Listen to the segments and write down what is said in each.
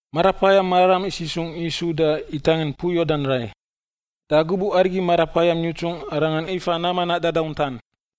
Marapayam Mararam isisungꞌ Yisu da itangin mpui Yordan rai. Da gubuꞌ arigi Marapayam yutsungꞌ Arangan ifa nam manaꞌ dadauntan.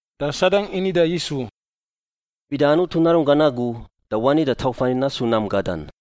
Da Sadang ini da Yisu, “Bida Anutu Narunggan agu, da wani da tauf ani nasu nam gadan.”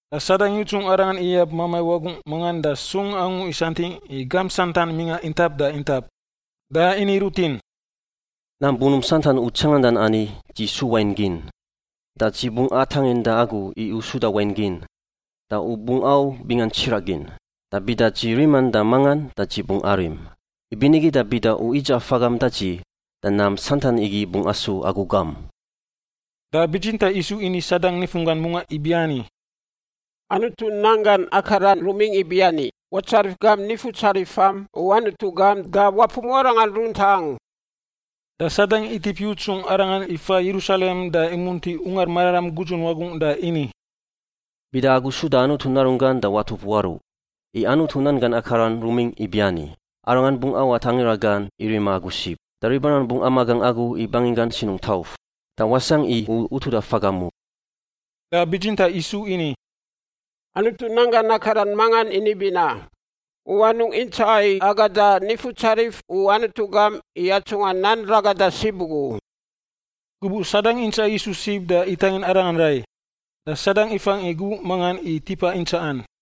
Da Sadang yutsungꞌ Arangan iyab mamai wagungꞌ mangan da sung angu isantingꞌ i gamp santan mingꞌa intap da intap. Da ini rutin, “Nam bunump santan u tsangandan ani dzi su wain gin, da dzi bungꞌ atangin da agu i u suda wain gin, da u bungꞌ au bingan tsiraꞌ gin. Da bida dzi riman da mangan da dzi bungꞌ arim. Ibinigi da bida u idzaꞌa fagam da dzi, da nam santan igi bungꞌ asu agu gam.” Da bitsintaꞌ Yisu ini Sadang nifunggan mungaꞌ ibiani, “Anutu nan gan akaran rumingꞌ ibiani, ‘Watsarif gam Nifutsarifam u Anutu gam da wapumuꞌ Arangan runtaꞌ angu.’” Da Sadang itip yutsungꞌ Arangan ifa Yerusalem da imunti Ungar Mararam gudzun wagungꞌ da ini, “Bida agu suda Anutu Narunggan da watup waruꞌ. I Anutu nan gan akaran rumingꞌ ibiani: ‘Arangan bungꞌ awat angira gan i rima agu sib. Da ribarangan bungꞌ amagangꞌ agu i banginggan sinungꞌ tauf, da wasangꞌ i u utuda fagam u.’” Da bitsintaꞌ Yisu ini, “Anutu nan gan akaran mangan ini binaꞌ, ‘U anungꞌ intsaꞌa i agada Nifutsarif u Anutu gam i atsungꞌa nan ragada sib ugu u.’” Gubuꞌ Sadang intsaꞌa Yisu sib da itangin Arangan rai, da Sadang ifangꞌ i gubuꞌ mangan i tipa intsaꞌan.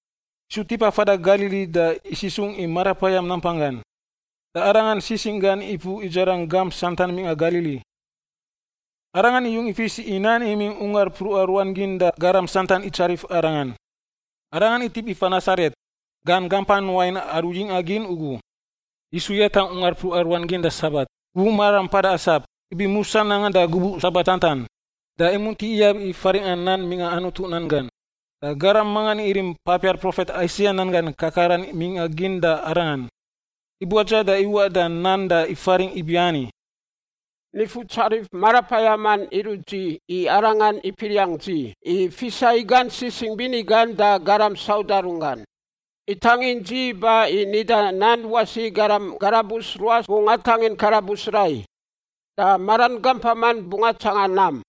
Yisu tipa fada Galili da isisungꞌ i Marapayam nampanggan, da Arangan sisingꞌ gan ipuꞌ idzarangꞌ gamp santan mingꞌa Galili. Arangan iyung ifis i nan imingꞌ ungar mpruꞌa ruan gin da garam santan itsarif Arangan. Arangan itip ifa Nasaret, gan gampan wain aru yingꞌa gin ugu. Yisu yatangꞌ ungar mpruꞌa ruan gin da Sabat, gubuꞌ mararam mpada asap, ibi musa nangan da gubuꞌ Sabat santan. Da imunti iyab i faringꞌa nan mingꞌa Anutu nan gan. Da garam mangan irim papiar profet Aisaia nan gan kakaran mingꞌa gin da Arangan. Ibuadza da iwaꞌ da nan da ifaringꞌ ibiani: “Nifutsarif Marapayaman irut dzi i Arangan ipiriangꞌ dzi i fisa i gan sisingꞌ bini gan da garam sauda runggan. Itangin dzi iba i nida nan wasi i garam karabus ruas bungꞌ atangin karabus rai, da maran gampaman bungꞌ atsanga nam,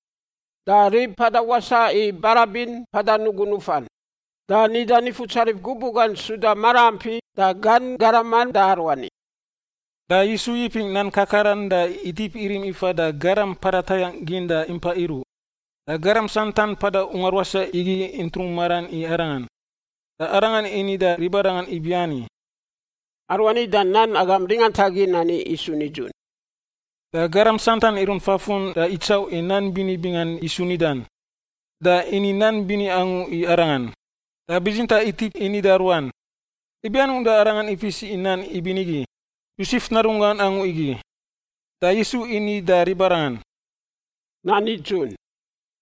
da rib mpada wasaꞌ i barabin mpada nugu nufan, da nida Nifutsarif gubuꞌ gan suda maraampi da gan garaman da aruani.” Da Yisu yipingꞌ nan kakaran da itip irim ifan da garam mpada tayangꞌ gin da impa iruꞌ. Da garam santan mpada ungar wasaꞌ igi intrung maran i Arangan. Da Arangan ini da ribarangan ibiani, “Aruani da nan agam ringantagin ani isu nidzun.” Da garam santan irunt fafun da itsauꞌ i nan bini bingan Yisu nidan, da ini nan bini angu i Arangan. Da bitsintaꞌ itip ini da ruan, “Ibi anungꞌ da arangan ifis i nan ibinigi? Yosef narunggan angu igi!” Da Yisu ini da ribarangan, “Nan nidzun,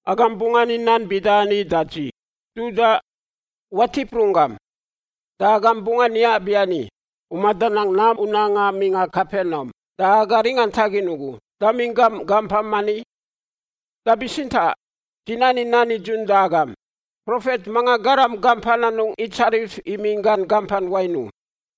agam bungꞌ ani nan bida ani da dzi, ‘Dudaꞌ, watip runggam!’ Da agam bungꞌ ani nabiani, ‘U madanang nam u nanga mingꞌa Kapenaum, da aga ringantagin ugu, damingꞌ gam gampam ani?’ “Da bitsintaꞌ, dzi nani nan nidzun da agam, profet mangan garam gampan anungꞌ itsarif imingꞌ gan gampan wain u.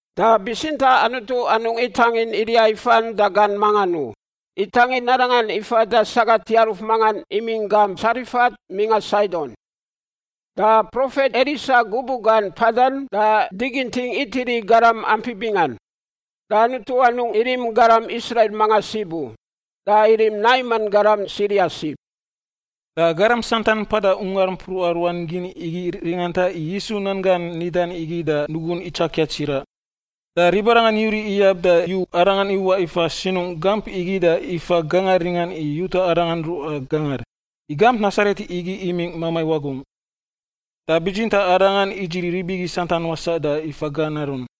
Da bitsintaꞌ Anutu anungꞌ itangin Eliya ifan da gan mangan u, itangin arangan ifan da sagat yaruf mangan imingꞌ gamp Tsarefat mingꞌa Saidon. Da profet Elisa gubuꞌ gan mpadan, da diginting itiri i garam ampi bingan. Da Anutu anungꞌ irim garam Israil mangan sib u, da irim Naiman garam Siria sib.” Da garam santan mpada ungar mpruꞌa ruan gin igi ringanta i Yisu nan gan nidan igi da nugun itsakia tsiraꞌ. Da ribarangan yuriꞌ iyab da iyut Arangan iwaꞌ ifa sinungꞌ gamp igi da ifa gangar ringan i yuta Arangan ruꞌa gangar, i gamp Nasaret igi imingꞌ mamai wagungꞌ. Da bitsintaꞌ Arangan idziri rib igi santan wasaꞌ da ifa gan arun.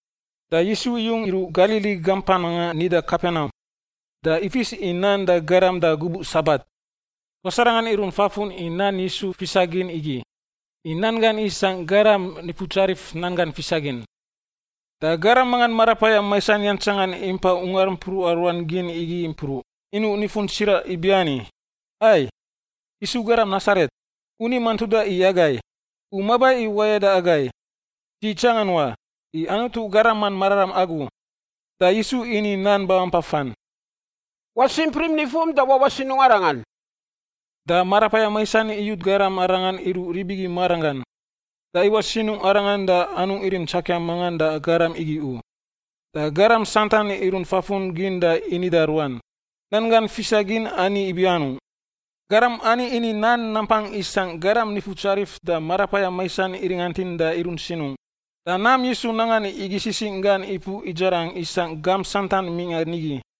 Da Yisu iyung iruꞌ Galili gampan mangan nida Kapenaum. Da ifis i nan da garam da gubuꞌ Sabat. Tuas arangan irunt fafun i nan Yisu fisagin igi, i nan gan isangꞌ garam nifutsarif nan gan fisagin. Da garam mangan marapayam maisan yantsangan impai ungar mpruꞌa ruan gin igi impruꞌ, inuꞌ nifun tsiraꞌ ibiani, “Ai, Yisu garam Nasaret! U ni mantuda i agai? U maba i wayada agai? Dzi itsangan wa, i Anutu Garaman Mararam agu.” Da Yisu ini nan babampafan, “Wasimprim nifum da wawaꞌ sinungꞌ arangan!” Da marapayam maisan iyut garam arangan iruꞌ rib igi maranggan, da iwaꞌ sinungꞌ arangan da anungꞌ irim tsakia mangan da garam igi u. Da garam santan irunt fafun gin da ini da ruan, “Nan gan fisagin ani ibianung? Garam ani ini nan nampang isangꞌ garam nifutsarif da marapayam maisan iringantin da irunt sinungꞌ!” Da nam Yisu nangan igi sisingꞌ gan ipuꞌ idzarangꞌ isangꞌ gamp santan mingꞌan nigi.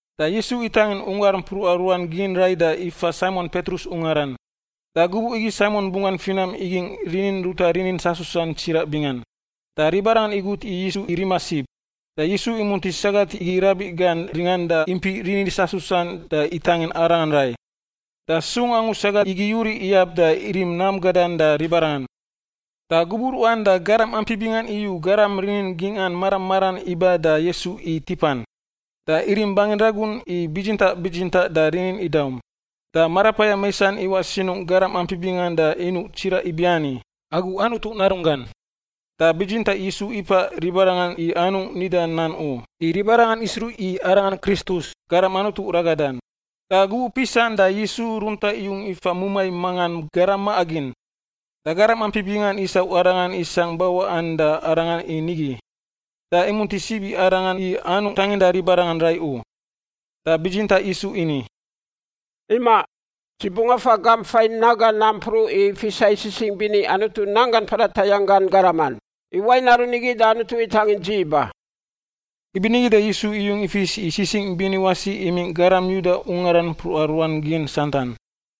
Da Yisu itangin ungar mpruꞌa ruan gin rai da ifa Saimon Petrus ungaran. Da gubuꞌ igi Saimon bunggan finam igingꞌ rinin ruta rinin sasusan tsiraꞌ bingan, da ribarangan igut i Yisu i rima sib. Da Yisu imunti sagat igi rabiꞌ gan ringan da impiꞌ rinin sasusan da itangin arangan rai. Da sung angu sagat igi yuriꞌ iyab da irim nam gadan da ribarangan. Da gubuꞌ ruꞌan da garam ampi bingan iyu garam rinin gingꞌan mara maran iba da Yisu i tipan. Da irim bangin ragun i bitsintaꞌ bitsintaꞌ da rinin idaum. Da marapayam maisan iwaꞌ sinungꞌ garam ampi bingan da inuꞌ tsiraꞌ ibiani, “Agu Anutu Narunggan!” Da bitsintaꞌ Yisu ipaꞌ ribarangan i anungꞌ nida nan u, i ribarangan isruꞌ i Arangan Kristus, Garam Anutu Ragadan. Da gubuꞌ pisan da Yisu runtaꞌ iyung ifa mumai mangan garam maꞌa gin. Da garam ampi bingan isau Arangan isangꞌ bawaꞌan da Arangan i nigi, da imunti sib i Arangan i anungꞌ tanginda ribarangan rai u. Da bitsintaꞌ Yisu ini, “Imaꞌ, dzi bungꞌ afa gamp fain naga nampruꞌ i fisa i sisingꞌ bini Anutu nanggan mpada tayangꞌ gan garaman, i wain aru nigi da Anutu itangin dzi iba.” Ibinigi da Yisu iyung ifis i sisingꞌ bini wasi imingꞌ garam Yuda ungaran mpruꞌa ruan gin santan.